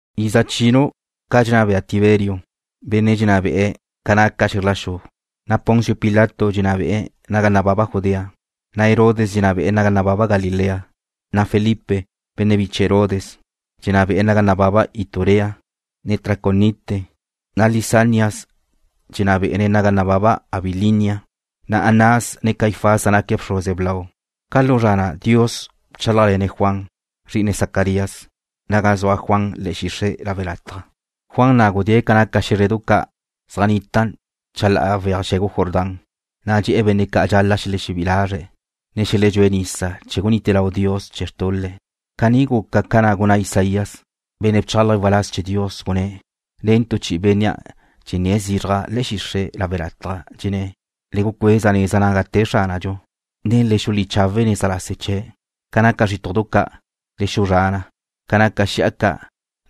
Iza chinu' ca dxenná bea Tiberio, benne' dxenná be'e ca naca xe̱zr la xu, na' Poncio Pilato dxenná be'e̱ naga nababa Judea, na' Herodes dxenná be'e̱ naga nababa Galilea, na' Felipe, benne' biche Herodes, dxenná be'e̱ naga nababa Iturea, ne Traconite, na' Lisanias dxenná be'e̱ naga nababa Abilinia. Na' Anás, ne Caifás zaj naque̱' bxruze blau. Ca lu zra na' Dios bchálajle̱ne̱' Juan, zri'ine Zacarías, naga zua Juan le̱'e̱ xixre' lawe' lataj. Juan na' gudée̱' ca naca xé̱zredu ca' zaj nnitan' chalá'a weaj xe̱gu Jordán, na' dxe̱'e̱ benne' ca' dxal-la' xelexebí'i lazre̱', ne xeledxúe̱' nisa chee̱ gunite lau Dios chee̱ xtul-le'. Caní guca ca na' gunná Isaías, benne' bchálaje̱' waláz chee̱ Dios, gunné̱': Nen tu chi'i bénnea' dxenné̱' zizraj le̱'e̱ xixre' lawe' lataj. Dxenné̱': Le gucueza neza naga te Xránadxu. Le xulí chawe' neza lase chee̱'. Ca naca zrítudu ca' le xuzrá na. Ca naca xi'a ca',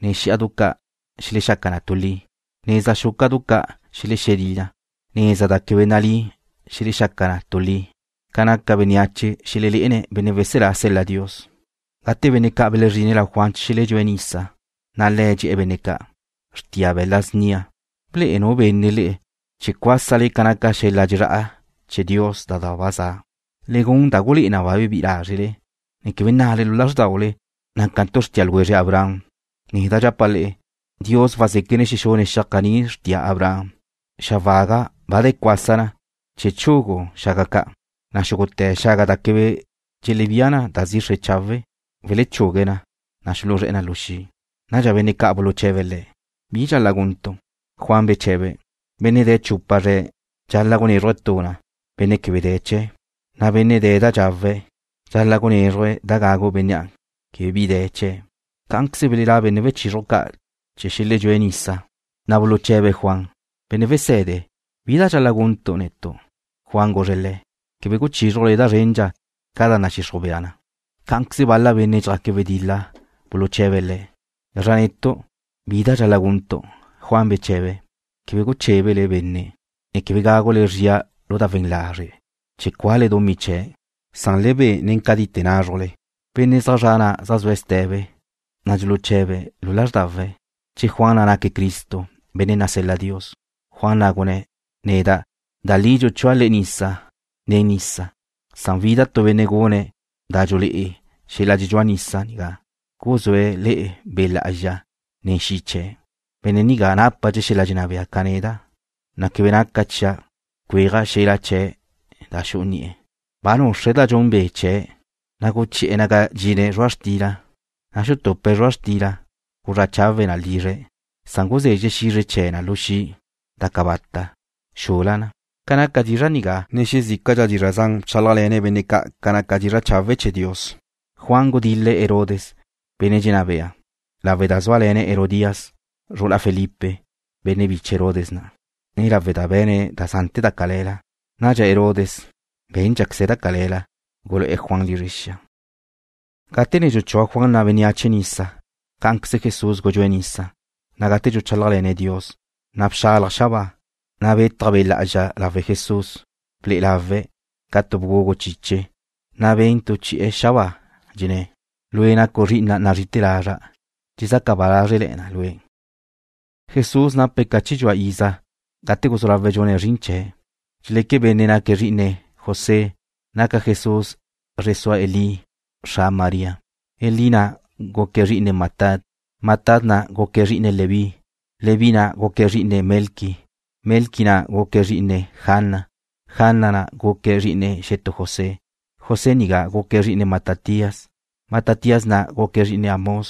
ne xí'adu ca' xelexaca na tu li. Neza xúca'du ca' xelexelí na. Neza da quebe nalí xelexaca na tu li. Ca naca bénneache xelelé'ene̱' Benne' Weselá sel-la Dios. Gate benne' ca' belezrine̱' lau Juan chee̱ xeledxúe̱' nisa, na' le̱' dxe̱'e̱ benne' ca': ―Xrtia be̱la snia. ¿Ble'e nu benne' le'e chee̱ cuásale ca naca xel-la dxezrá'a chee̱ Dios da ba za? Le gun da gulé'e na ba bebí'i lázrele, ne quebe nnale lu lázrdaule: Nácantu' xrtia ljwezre Abraham. Neda' dxapa' le'e, Dios wazéquene̱' xexune̱' xiaj caní xrtia Abraham. Xa waga ba de̱ cuásate̱ na chee̱ chugue̱' xaga ca', na' xúgute̱ xaga da quebe dxelebía na da zixre chawe' welechugue na, na' xuluzré̱'e̱ na lu xi'. Nadxa benne' ca' buluche̱be̱' le̱': ―¿Bi dxal-la' guntu'? Juan beche̱be̱': ―Benne' de̱ chupa zre̱' dxal-la' gunézruje̱' tu na benne' quebe de̱ chee̱', na' benne' de̱ da dxawe̱' dxal-la' gunézruje̱' da gagu bénnea' quebe bi de̱ chee̱'. Cá'anqueze belelá' benne' wechizruj ca' chee̱ xeledxúe̱' nisa, na' buluche̱be̱' Juan: ―Benne' wese̱de, ¿bi da dxal-la' guntu' netu'? Juan guzre̱' le̱': ―Quebe guchízrujle da zrendxa ca da nadxixruj bea na. Cá'anqueze bal-la benne' dxjaque̱' wedil-la buluche̱be̱' le̱': ―¿Gazra netu'? ¿Bi da dxal-la' guntu'? Juan beche̱be̱': ―Quebe guchébele benne', ne quebe gágule le̱' zria lu da we̱n lazre' chee̱ cuale dumí chee̱', na' le be nen cadite názrujle. Benne' zaj zre̱'e̱ na' zaj zue̱' ste̱be, na' dxuluche̱be̱' lu lázrdawe̱' che Juan na' naque̱' Cristo, benne' nasel-la Dios. Juan na' gunné̱': ―Neda', da li dxuchúa' le'e nisa nen nisa. Wida tu benne' gune̱' da dxulé'e xel-la dxedxúa nisa nigá, guzúe̱' le'e Be' Lá'azxa, ne xi' chee̱'. Benne' nigá nápadxe̱' xel-la dxenná bea ca neda', na' quebe naca chia' cuéaja' xel-la chee̱' da xu'u ni'e̱. Ba nuxre̱' da dxun be' chee̱', na' guchi'e̱ naga dxine̱' zrua' xtila. Na' xutupe̱' zrua' xtila, guzrá' chawe̱' na lizre̱'. Guzezxe̱' xizre chee̱ na lu xi' da cabata' xul-la na. Ca naca dizra' nigá, ne xezícadxa dizra' zan bchálajle̱ne̱' benne' ca' ca naca dizra' chawe' chee̱ Dios. Juan gudil-le̱' Herodes, benne' dxenná be'e̱, lawe' da zúale̱ne̱' Herodías, zru'ula Felipe, benne' biche Herodes na', ne lawe' da ba be̱ne̱' da zante̱ da cale̱la. Nadxa Herodes bé̱ndxaqueze̱' da cale̱la, gulu'e̱ Juan lizre xia. Gate ne dxuchúa Juan na' bénneache nisa, cá'anqueze Jesús gudxúe̱' nisa, na' gate dxuchálajle̱ne̱' Dios, na' bxalaj xabáa, na' betaj Be' Lá'azxa lawe' Jesús. Ble'e lawe̱' ca tu bgugu chiche, na' ben tu chi'e̱ xabáa, dxenné̱': ―Lue' nacu' zri'ina' nazrí'ite̱ lazra'. Dxezaca ba lázrele̱na' Lue'. Jesús nape̱' ca chi dxua iza gate guzú lawe̱' dxune̱' zrin chee̱'. Dxeleque benne' naque̱' zri'ine José. Naca Jesús zre sua Elí, xra María. Elí na' guque̱' zri'ine Matat, Matat na' guque̱' zri'ine Leví, Leví na' guque̱' zri'ine Melqui, Melqui na' guque̱' zri'ine Jana, Jana na' guque̱' zri'ine xetú José. José nigá guque̱' zri'ine Matatías, Matatías na' guque̱' zri'ine Amós,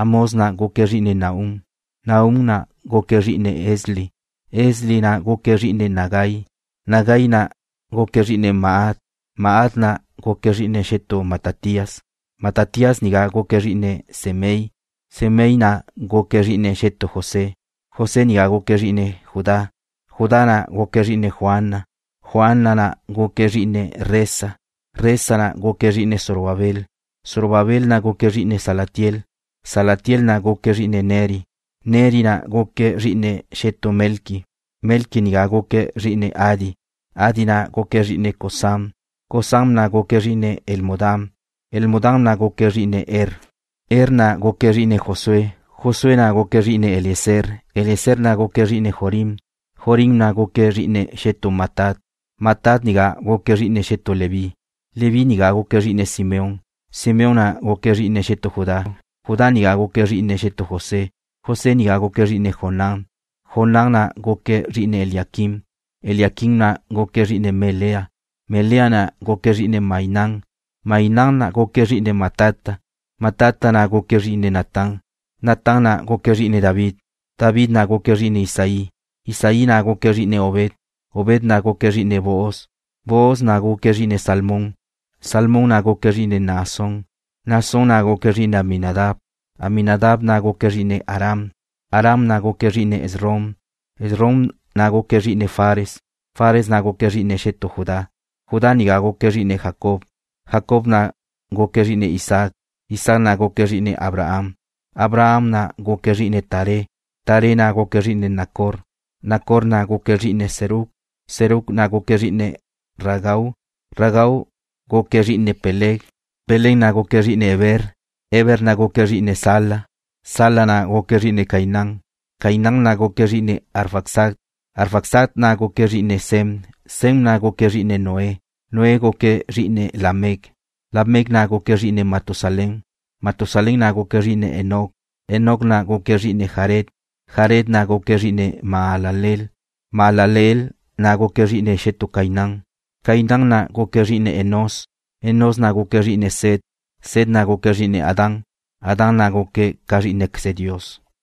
Amós na' guque̱' zri'ine Nahum, Nahum na' guque̱' zri'ine Esli, Esli na' guque̱' zri'ine Nagai. Nagai na' guque̱' zri'ine Maat, Maat na' guque̱' zri'ine xetú Matatías, Matatías nigá guque̱' zri'ine Semei, Semei na' guque̱' zri'ine xetú José, José nigá guque̱' zri'ine Judá. Judá na' guque̱' zri'ine Joana, Joana na' guque̱' zri'ine Resa, Resa na' guque̱' zri'ine Zorobabel, Zorobabel na' guque̱' zri'ine Salatiel, Salatiel na' guque̱' zri'ine Neri. Neri na' guque̱' zri'ine xetú Melqui, Melqui nigá guque̱' zri'ine Adi, Adi na' guque̱' zri'ine Cosam, Cosam na' guque̱' zri'ine Elmodam, Elmodam na' guque̱' zri'ine Er, Er na' guque̱' zri'ine Josué, Josué na' guque̱' zri'ine Eliezer, Eliezer na' guque̱' zri'ine Jorim, Jorim na' guque̱' zri'ine xetú Matat, Matat nigá guque̱' zri'ine xetú Leví, Leví nigá guque̱' zri'ine Simeón, Simeón na' guque̱' zri'ine xetú Judá, Judá nigá guque̱' zri'ine xetú José, José nigá guque̱' zri'ine Jonán, Jonán na' guque̱' zri'ine Eliaquim, Eliaquim na' guque̱' zri'ine Melea, Melea na' guque̱' zri'ine Mainán, Mainán na' guque̱' zri'ine Matata, Matata na' guque̱' zri'ine Natán. Natán na' guque̱' zri'ine David, David na' guque̱' zri'ine Isaí, Isaí na' guque̱' zri'ine Obed, Obed na' guque̱' zri'ine Booz, Booz na' guque̱' zri'ine Salmón, Salmón na' guque̱' zri'ine Naasón. Naasón na' guque̱' zri'ine Aminadab, Aminadab na' guque̱' zri'ine Aram, Aram na' guque̱' zri'ine Esrom, Esrom na' guque̱' zri'ine Fares, Fares na' guque̱' zri'ine xetú Judá, Judá nigá guque̱' zri'ine Jacob, Jacob na' guque̱' zri'ine Isaac, Isaac na' guque̱' zri'ine Abraham, Abraham na' guque̱' zri'ine Taré, Taré na' guque̱' zri'ine Nacor. Nacor na' guque̱' zri'ine Serug, Serug na' guque̱' zri'ine Ragau, Ragau na' guque̱' zri'ine Peleg, Peleg na' guque̱' zri'ine Heber, Heber na' guque̱' zri'ine Sala, Sala na' guque̱' zri'ine Cainán, Cainán na' guque̱' zri'ine Arfaxad, Arfaxad na' guque̱' zri'ine Sem, Sem na' guque̱' zri'ine Noé, Noé na' guque̱' zri'ine Lamec, Lamec na' guque̱' zri'ine Matusalén, Matusalén na' guque̱' zri'ine Enoc, Enoc na' guque̱' zri'ine Jared, Jared na' guque̱' zri'ine Mahalaleel, Mahalaleel na' guque̱' zri'ine xetú Cainán. Cainán na' guque̱' zri'ine Enós, Enós na' guque̱' zri'ine Set, Set na' guque̱' zri'ine Adán, Adán na' guque̱' ca zrí'inequeze Dios.